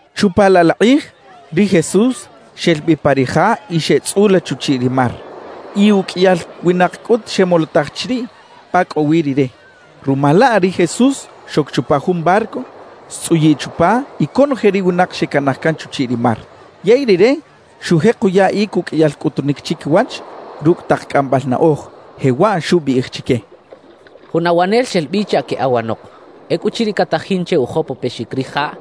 Chupa laꞌ la kꞌij, ri Jesús xel bi pa ri ja y xeꞌtzꞌula chuchiꞌ ri mar. Y uqꞌuiyal winak cꞌut xemolotaj chiriꞌ pa cꞌo wi Rire. Ruma laꞌ, ri Jesús xoc chupa jun barco, xtzꞌuyiꞌ chupa y conoje ri winak xecanaj can chuchiꞌ ri mar. Yey Rire xujek uyaꞌic uqꞌuiyal cꞌutunic chiquiwach rucꞌ tak cꞌambal naꞌoj, jewaꞌ xubiꞌij chique: «Jun awanel xel bi chaꞌ queꞌawanok. Ecꞌuchiriꞌ catajin che ujopopexic rijaꞌ,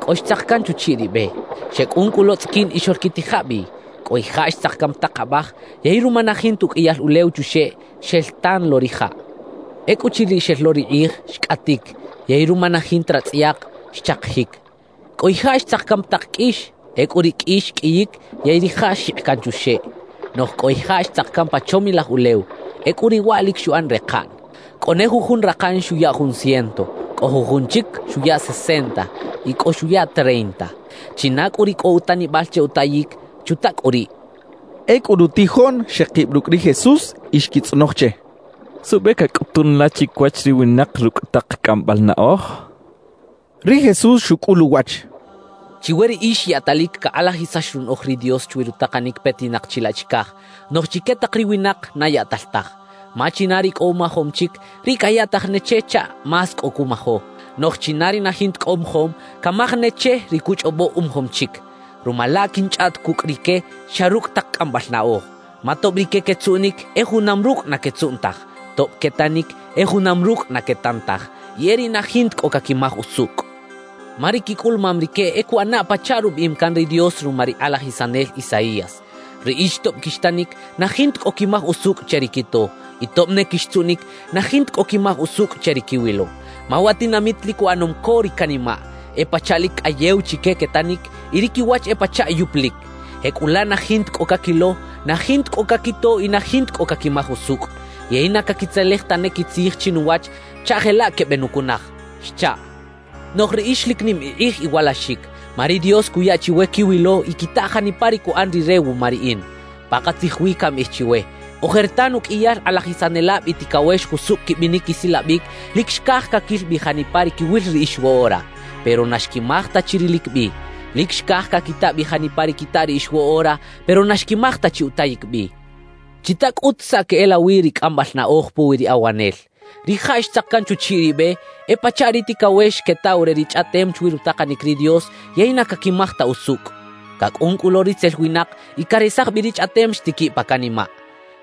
cꞌo xtzak can chuchiꞌ ri be. Xecꞌun cꞌu lo tzꞌiquin y xoꞌlquitija bi. »Cꞌo ijaꞌ xtzak can pa tak abaj; yey ruma na jinta uqꞌuiyal ulew chuxeꞌ, xel tan lo rijaꞌ. Ecꞌuchiriꞌ xel lo ri kꞌij, xcꞌatic; yey ruma na jinta ratzꞌayak, xchakijic. »Cꞌo ijaꞌ xtzak can pa tak qꞌuix. Ecꞌu ri qꞌuix xqꞌuiyic yey rijaꞌ xjikꞌ can chuxeꞌ. »Noꞌj cꞌo ijaꞌ xtzak can pa chomilaj ulew. Ecꞌu riꞌ waꞌ lic xuꞌan rekaꞌn. Cꞌo ne jujun rakan xuya jun ciento, cꞌo jujun chic xuya sesenta y cꞌo xuya treinta. China cꞌu ri cꞌo utanibal che utayic, ¡chuta cꞌu riꞌ!» xchaꞌ. Ecꞌu rutijoꞌn xekib rucꞌ ri Jesús y xquitzꞌonoj che: —¿Suꞌbe cacꞌutun la chiquiwach ri winak rucꞌ tak cꞌambal naꞌoj? —xechaꞌ. Ri Jesús xucꞌul uwach: —Chiwe riꞌix yaꞌtalic cakꞌalajisax runaꞌoj ri Dios chwi rutakanic petinak chilaꞌ chicaj; noꞌj chique tak ri winak, na yaꞌtal taj. Ma china ri cꞌo umajom chic, riꞌ cayaꞌtaj ne che chaꞌ más cꞌo cumajo. Noꞌj china ri na jinta cꞌo umajom, camaj ne che ri cuchꞌobo umajom chic. Ruma laꞌ quinchꞌaꞌt cucꞌ rique xa rucꞌ tak cꞌambal naꞌoj. Ma tob rique quetzuꞌnic, e junam rucꞌ na quetzuꞌn taj; tob quetanic, e junam rucꞌ na quetan taj y e riꞌ na jinta cꞌo caquimaj usucꞌ. Ma ri quicꞌulumam rique e cuꞌana pachaꞌ rubiꞌim can ri Dios ruma ri kꞌalajisanel Isaías: Riꞌix tob quixtanic, na jinta cꞌo quimaj usucꞌ che ri quito; y tob ne quixtzuꞌnic, na jinta cꞌo quimaj usucꞌ che ri quiwilo. Ma wa tinamit lic uꞌanom co ri canimaꞌ; e pachaꞌ lic cꞌayew chique quetanic, y ri quiwach e pachaꞌ yupulic. Jecꞌulaꞌ na jinta cꞌo caquilo, na jinta cꞌo caquito y na jinta cꞌo caquimaj usucꞌ; yey na caquitzelej tane quitzij chinuwach chaꞌ jelaꞌ quebenucunaj xchaꞌ. »Noꞌj riꞌix lic nim ikꞌij iwalaxic, ma ri Dios cuya chiwe quiwilo y quita janipa ri cuꞌan Rire wuma riꞌin. Pakatzij wi cambiꞌij chiwe: Ojertan uqꞌuiyal kꞌalajisanelab y ticawex jusucꞌ quibinic quisilabic lic xcaj caquil bi janipa ri quiwil riꞌix woꞌora; pero na xquimaj ta chi rilic bi. Lic xcaj caquita bi janipa ri quita riꞌix woꞌora, pero na xquimaj ta chi utayic bi. »Chita cꞌut saꞌ queꞌelawi ri cꞌambal naꞌoj puwi ri awanel. Rijaꞌ xtzak can chuchiꞌ ri be, e pachaꞌ ri ticawex quetaw re ri chꞌaꞌtem chwi rutakanic ri Dios yey na caquimaj ta usucꞌ. Cacꞌun cꞌu lo ritzel winak y caresaj bi ri chꞌaꞌtem xtiquiꞌ pa canimaꞌ.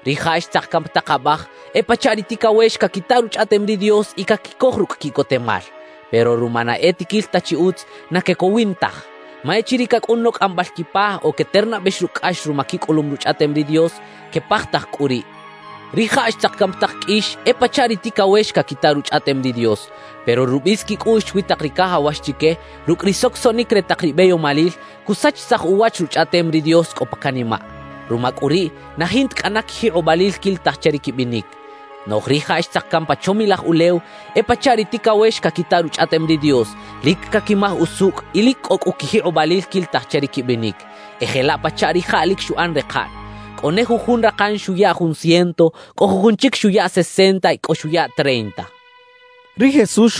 »Rijaꞌ xtzak can pa tak abaj, e pachaꞌ ri ticawex caquita Ruchꞌaꞌtem ri Dios y caquicoj rucꞌ quiꞌcotemal. Pero ruma na e tiquil ta chi utz, na quecowin taj. Ma echiriꞌ cacꞌun lo cꞌambal quipa o queternabex rucꞌ cꞌax ruma quicꞌulum Ruchꞌaꞌtem ri Dios, quepajtaj cꞌu riꞌ. »Rijaꞌ xtzak can pa tak qꞌuix e pachaꞌ ri ticawex caquita Ruchꞌaꞌtem ri Dios. Pero rubis quicꞌuꞌx chwi tak ri cajawax chique, rucꞌ ri socosoꞌnic re tak ri beyomalil, cusachisaj uwach Ruchꞌaꞌtem ri Dios cꞌo pa canimaꞌ. Ruma cꞌu riꞌ, na jinta cꞌana quijikꞌobalil quilitaj che ri quibinic. »Noꞌj rijaꞌ xtzak can pa chomilaj ulew e pachaꞌ ri ticawex caquita Ruchꞌaꞌtem ri Dios, lic caquimaj usucꞌ y lic cꞌo cꞌu quijikꞌobalil quilitaj che ri quibinic. E jelaꞌ pachaꞌ rijaꞌ lic xuꞌan rekaꞌn; cꞌo ne jujun rakan xuya jun ciento, cꞌo jujun chic xuya sesenta y cꞌo xuya treinta —xcha ri Jesús.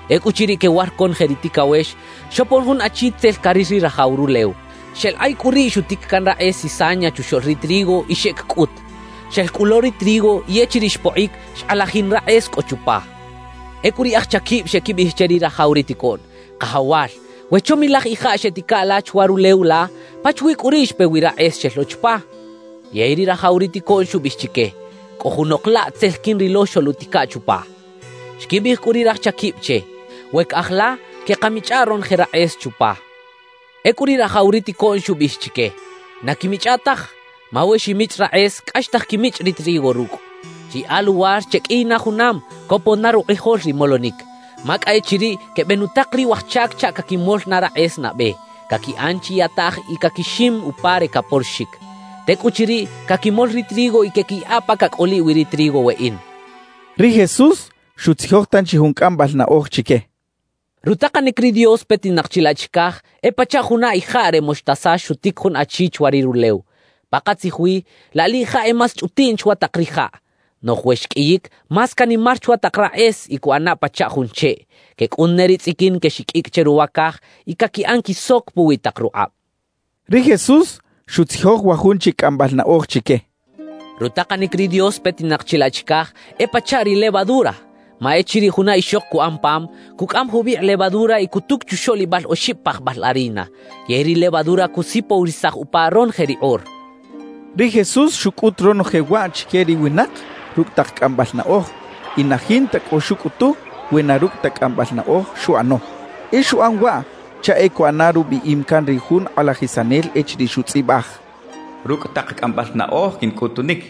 Ecꞌuchiriꞌ quewar conoje ri ticawex, xopon jun achi tzel caril ri rajaw rulew; xeꞌlakꞌay cꞌu riꞌ xutic can rakꞌes cizaña chuxoꞌl ri trigo y xeꞌec cꞌut. Xel cꞌu lo ri trigo y echiriꞌ xpokꞌic, xkꞌalajin rakꞌes cꞌo chupa. Ecꞌu ri aj chaquib xeꞌquibiꞌij che ri rajaw ri ticoꞌn: “Kajawal, we chomilaj ijaꞌ xeꞌtica la chwa rulew la, ¿pachawi cꞌu riꞌ xpe wi rakꞌes xel lo chupa?” »Yey ri rajaw ri ticoꞌn xubiꞌij chique: “Cꞌo junok laꞌ tzel quinrilo xoluꞌtica chupa.” Xquibiꞌij cꞌu ri raj chaquib che: “We caꞌaj la, queꞌkamichꞌa ronoje rakꞌes chupa.” »Ecꞌu ri rajaw ri ticoꞌn xubiꞌij chique: “Na quiꞌmichꞌa taj; ma we ximichꞌ rakꞌes, cꞌaxtaj quimichꞌ ri trigo rucꞌ. Chiyaꞌa luwar cheqꞌuiy na junam, copon na rukꞌijol ri molonic. Ma cꞌa e chiriꞌ quebenutak ri waj chac chaꞌ caquimol na rakꞌes nabe, caquiꞌan chiyataꞌj y caquixim upa re caporoxic. Tecꞌuchiriꞌ, caquimol ri trigo y queꞌquiyaꞌa pa cacꞌoliꞌ wi ri trigo weꞌin”» xchaꞌ. Ri Jesús xutzijoj tanchi jun cꞌambal naꞌoj chique: «Rutakanic ri Dios petinak chilaꞌ chicaj e pachaꞌ juna ijaꞌ re moxtasa xutic jun achi chwa ri rulew. Pakatzij wi, laꞌ liꞌjaꞌ e más chꞌutiꞌn chwa tak rijaꞌ; noꞌj we xqꞌuiyic, más canimar chwa tak rakꞌes y cuꞌana pachaꞌ jun cheꞌ. Quecꞌun ne ri tzꞌiquin quexiqꞌuicꞌ che ruwa caj y caquiꞌan quisoc puwi tak rukꞌab» xchaꞌ. Ri Jesús xutzijoj wa jun chic cꞌambal naꞌoj chique: «Rutakanic ri Dios petinak chilaꞌ chicaj e pachaꞌ ri levadura. Ma echiriꞌ juna ixok cuꞌan pam, cucꞌam jubikꞌ levadura y cutuc chuxoꞌlibal oxib pajbal harina; yey ri levadura cusipowirisaj upa ronoje ri kꞌor» xchaꞌ. Ri Jesús xucꞌut ronoje waꞌ chique ri winak rucꞌ tak cꞌambal naꞌoj y na jinta cꞌo xucꞌutu we na rucꞌ ta cꞌambal naꞌoj xuꞌano. E xuꞌan waꞌ chaꞌ e cuꞌana rubiꞌim can ri jun kꞌalajisanel echiriꞌ xutzꞌibaj: Rucꞌ tak cꞌambal naꞌoj quincꞌutunic;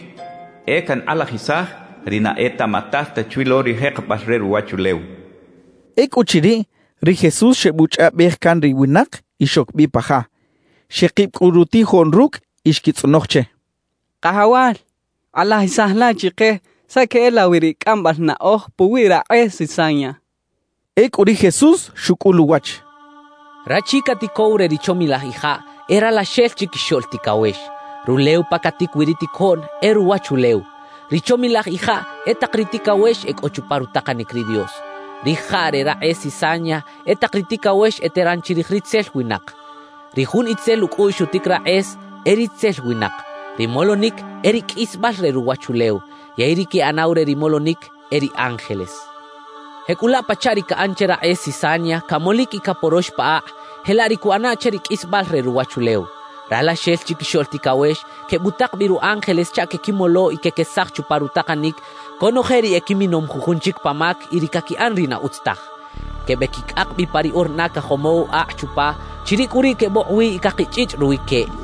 e cankꞌalajisaj ri na etaꞌmatal ta chwi lo ri jekebal re ruwachulew xchaꞌ. Ecꞌuchiriꞌ, ri Jesús xebuchꞌaꞌbej can ri winak y xoc bi pa ja. Xekib cꞌu rutijoꞌn rucꞌ y xquitzꞌonoj che: —Kajawal, kꞌalajisaj la chike saꞌ queꞌelawi ri cꞌambal naꞌoj puwi rakꞌes cizaña —xechaꞌ. Ecꞌu ri Jesús xucꞌul uwach: —Rachi caticow re ri chomilaj ijaꞌ e Ralaxel Chiquixoꞌl Ticawex. Rulew pa catic wi ri ticoꞌn e ruwachulew. Ri chomilaj ijaꞌ e tak ri ticawex e cꞌo chupa rutakanic ri Dios. Rijaꞌ re rakꞌes cizaña e tak ri ticawex eteran chirij ritzel winak. Ri jun itzel ucꞌuꞌx xutic rakꞌes e ritzel winak. Ri molonic e ri qꞌuisbal re ruwachulew, yey ri queꞌanaw re ri molonic e ri ángeles. »Jecꞌulaꞌ pachaꞌ ri caꞌan che rakꞌes cizaña, camolic y caporox pa akꞌ, jelaꞌ ri cuꞌana che ri qꞌuisbal re ruwachulew. Ralaxel Chiquixoꞌl Ticawex quebutak bi ru ángeles chaꞌ quequimolo y quequesaj chupa rutakanic conoje ri equiminom jujun chic pa mac y ri caquiꞌan ri na utz taj. Quebequicꞌak bi pa ri orna cajomow akꞌ chupa; chiriꞌ cꞌu riꞌ quebokꞌ wi y cakichꞌichꞌ ruwi queꞌ.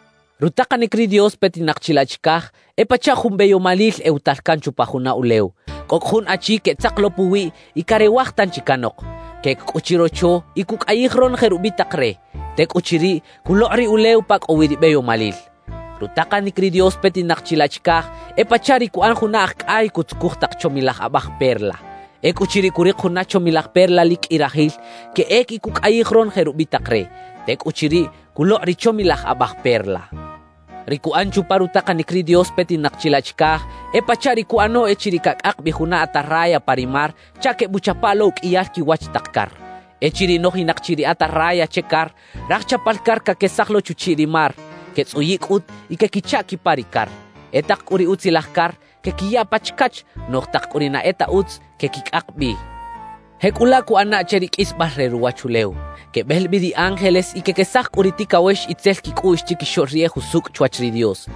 «Rutakanic ri Dios petinak chilaꞌ chicaj e pachaꞌ jun beyomalil ewatal can chupa juna ulew. Cꞌo cꞌu jun achi queꞌtzak lo puwiꞌ y carewaj tanchi canok. Queꞌec cꞌu chirocho y cuꞌcꞌayij ronoje rubitak re; tecꞌuchiriꞌ, culokꞌ ri ulew pa cꞌo wi ri beyomalil. »Rutakanic ri Dios petinak chilaꞌ chicaj e pachaꞌ ri cuꞌan juna aj cꞌay cutzucuj tak chomilaj abaj perla. Ecꞌuchiriꞌ curik juna chomilaj perla lic qꞌui rajil, queꞌec y cuꞌcꞌayij ronoje rubitak re; tecꞌuchiriꞌ, culokꞌ ri chomilaj abaj perla. »Ri cuꞌan chupa rutakanic ri Dios petinak chilaꞌ chicaj e pachaꞌ ri cuꞌano echiriꞌ cacꞌak bi juna atarraya pa ri mar chaꞌ quebuꞌchapa lo uqꞌuiyal quiwach tak car. »Echiriꞌ nojinak chi ri atarraya che car, raj chapal car caquesaj lo chuchiꞌ ri mar, quetzꞌuyiꞌ cꞌut y quequichaꞌ quipa ri car. E tak cꞌu ri utzilaj car, quequiya pa chacach; noꞌj tak cꞌu ri na e ta utz, quequicꞌak bi. »Jecꞌulaꞌ cuꞌana che ri qꞌuisbal re ruwachulew. Quebel bi ri ángeles y quequesaj cꞌu ri ticawex itzel quicꞌuꞌx chiquixoꞌl ri e jusucꞌ chwach ri Dios.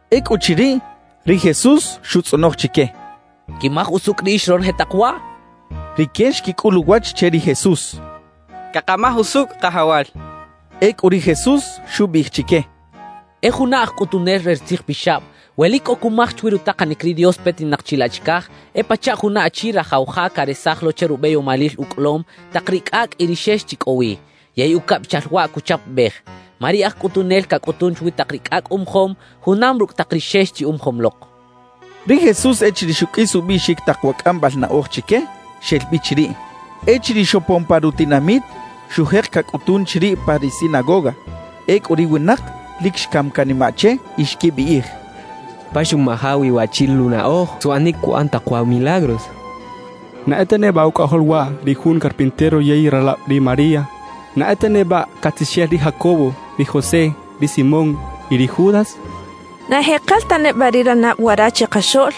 Ecꞌuchiriꞌ, ri Jesús xutzꞌonoj chique: —¿Quimaj usucꞌ riꞌix ronoje tak waꞌ? —xchaꞌ. Rique xquicꞌul uwach che ri Jesús: —Cakamaj usucꞌ, Kajawal —xechaꞌ. Ecꞌu ri Jesús xubiꞌij chique: —E juna aj cꞌutunel re ri tzijpixab, we lic cꞌo cumaj chwi rutakanic ri Dios petinak chilaꞌ chicaj, e pachaꞌ juna achi rajaw ja caresaj lo che rubeyomalil ucꞌolom, tak ri cꞌacꞌ y ri xex chi cꞌo wi; yey ucabichal waꞌ cuchapabej. Ma ri aj cꞌutunel cacꞌutun chwi tak ri cꞌacꞌ umajom, junam rucꞌ tak ri xex chi umajom lok —xchaꞌ. Ri Jesús echiriꞌ xuqꞌuis ubiꞌxic tak wa cꞌambal naꞌoj chique, xel bi chiriꞌ. Echiriꞌ xopon pa rutinamit, xujek cacꞌutun chiriꞌ pa ri sinagoga. Ecꞌu ri winak lic xcam canimaꞌ che y xquibiꞌij: —¿Pa xuꞌmaja wi waꞌchi luꞌnaꞌoj? ¿Suꞌanic cuꞌan tak wa milagros? ¿Na e ta neba ucꞌajol waꞌ ri jun carpintero yey ralab ri María? ¿Na e ta neba catzixel ri Jacobo, ri José, ri Simón y ri Judas? ¿Na ejekel ta neba ri ranab wara chikaxoꞌl?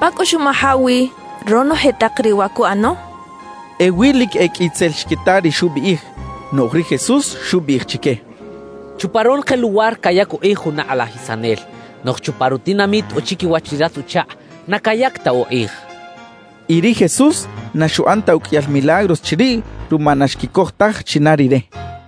¿Pa cꞌu xuꞌmaja wi ronoje tak riꞌ wa cuꞌano? —xechaꞌ. Ewi lic e qꞌui tzel xquita ri xubiꞌij. Noꞌj ri Jesús xubiꞌij chique: —Chupa ronoje luwar cayac ukꞌij juna kꞌalajisanel; noꞌj chupa rutinamit o chiquiwach ri ratz-uchakꞌ, na cayac ta ukꞌij —xchaꞌ. Y ri Jesús na xuꞌan ta uqꞌuiyal milagros chiriꞌ ruma na xquicoj taj china Rire.